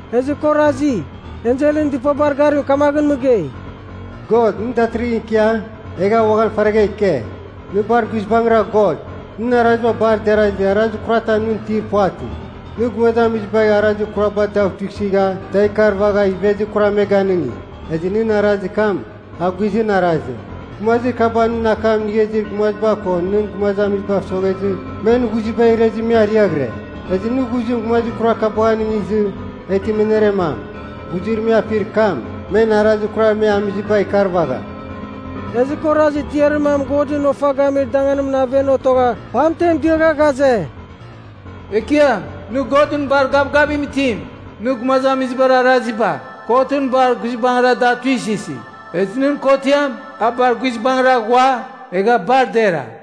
Ezɨ kɨ orazi, enselɨn dɨpabar garim kamaghɨn mɨgei, “God, nɨ datɨrɨghɨn ikia, egha uaghan faragha ike. Nɨ bar guizbangɨra God. Nɨn araziba bar derazɨ arazir kuratam nɨn itir puvatɨ. Nɨ gumazamizibar arazir kuraba da tuisɨgha da ikarvagha ivezir kuram me ganɨngi, ezɨ nɨn arazir kam a guizɨn arazim. Gumazir kaba nɨn akam inigha izir gumaziba ko nɨn gumazamizibav soghezɨ men ghuziba irezɨ me ariaghɨre. Ezɨ nɨ ghuzim gumazir kurar kabagh anɨngizɨ, eghtɨ me aneremam. Ghuzir me apir kam, men arazir kurar me amiziba ikarvagham.” Ezɨ kɨ orazi tiarir mam Godɨn ofa gamir danganimɨn aven otogha pamten diagha ghaze, “Ekiam, nɨ Godɨn bar gavgavim itim. Nɨ gumazamizibar araziba kotɨn bar guizbangɨra da tuisɨsi, ezɨ nɨn kotiam a bar guizbangɨra ghua egha bar dera.”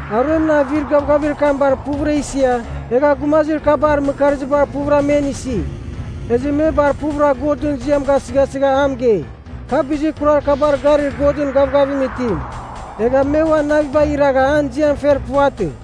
Aruemɨn avir gavgavir kam bar puvɨra isia, egha gumazir kabar mɨkarziba puvɨra men isi. Ezɨ me bar puvɨra Godɨn ziam gasɨghasɨgha a mɨgei, kar bizir kurar kabar garir Godɨn gavgavim itim. Egha me uan navibagh iragha an ziam fer puvatɨ.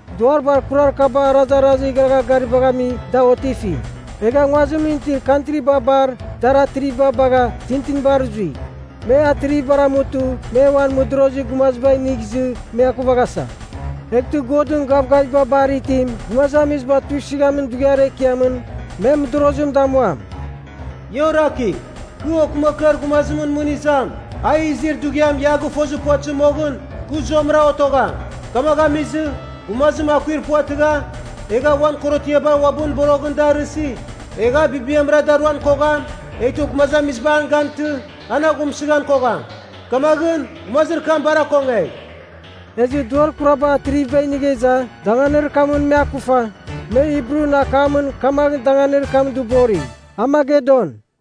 Duar bar kurar kaba arazarazir igharagha garibagh ami da otifi, egha nguazimɨn itir kantriba bar dar atriviba bagha, tintinibar zui. Me atrivibar amutɨ me uan mɨdorozir gumaziba inigh izɨ me akuvasa. Eghtɨ Godɨn Gavgaviba Bar Itim gumazamiziba tuisɨghamin dughiar ekiamɨn, me mɨdorozim damuam. “Ia orakigh! Kɨ, okɨmakɨar gumazimɨn mɨn izam, a izir dughiam ia a gɨfozir puvatɨzir moghɨn, kɨ zuamɨra otogham. Kamagh amizɨ, gumazim akuir puvatɨgha, egha uan korotiaba uabɨn boroghɨn da arɨsi, egh a bibiamra daruan kogham, eghtɨ gumazamiziba an gantɨ, an aghumsɨghan kogham. Kamaghɨn, gumazir kam bar akongegh.” Ezɨ duar kuraba atriviba inigha iza danganir kamɨn me akufa, me Hibrun akamɨn kamagh danganir kam dɨbori, Armagedon.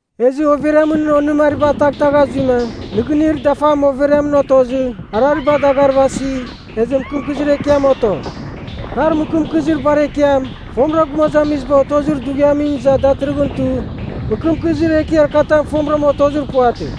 Ezɨ overiamɨn onɨmariba taghtagha zuima, nɨgɨnir dafam overiamɨn otozɨ, arariba dagarvasi, ezɨ mɨkɨmkɨzir ekiam oto. Kar mɨkɨmkɨzir bar ekiam, fomɨra gumazamiziba otozir dughiamɨn iza datɨrɨghɨn tu, mɨkɨmkɨzir ekiar katam fomɨra otozir puvatɨ.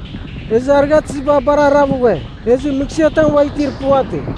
Ezɨ arighatɨziba bar arav ghue, ezɨ mɨghsɨatam ua itir puvatɨ.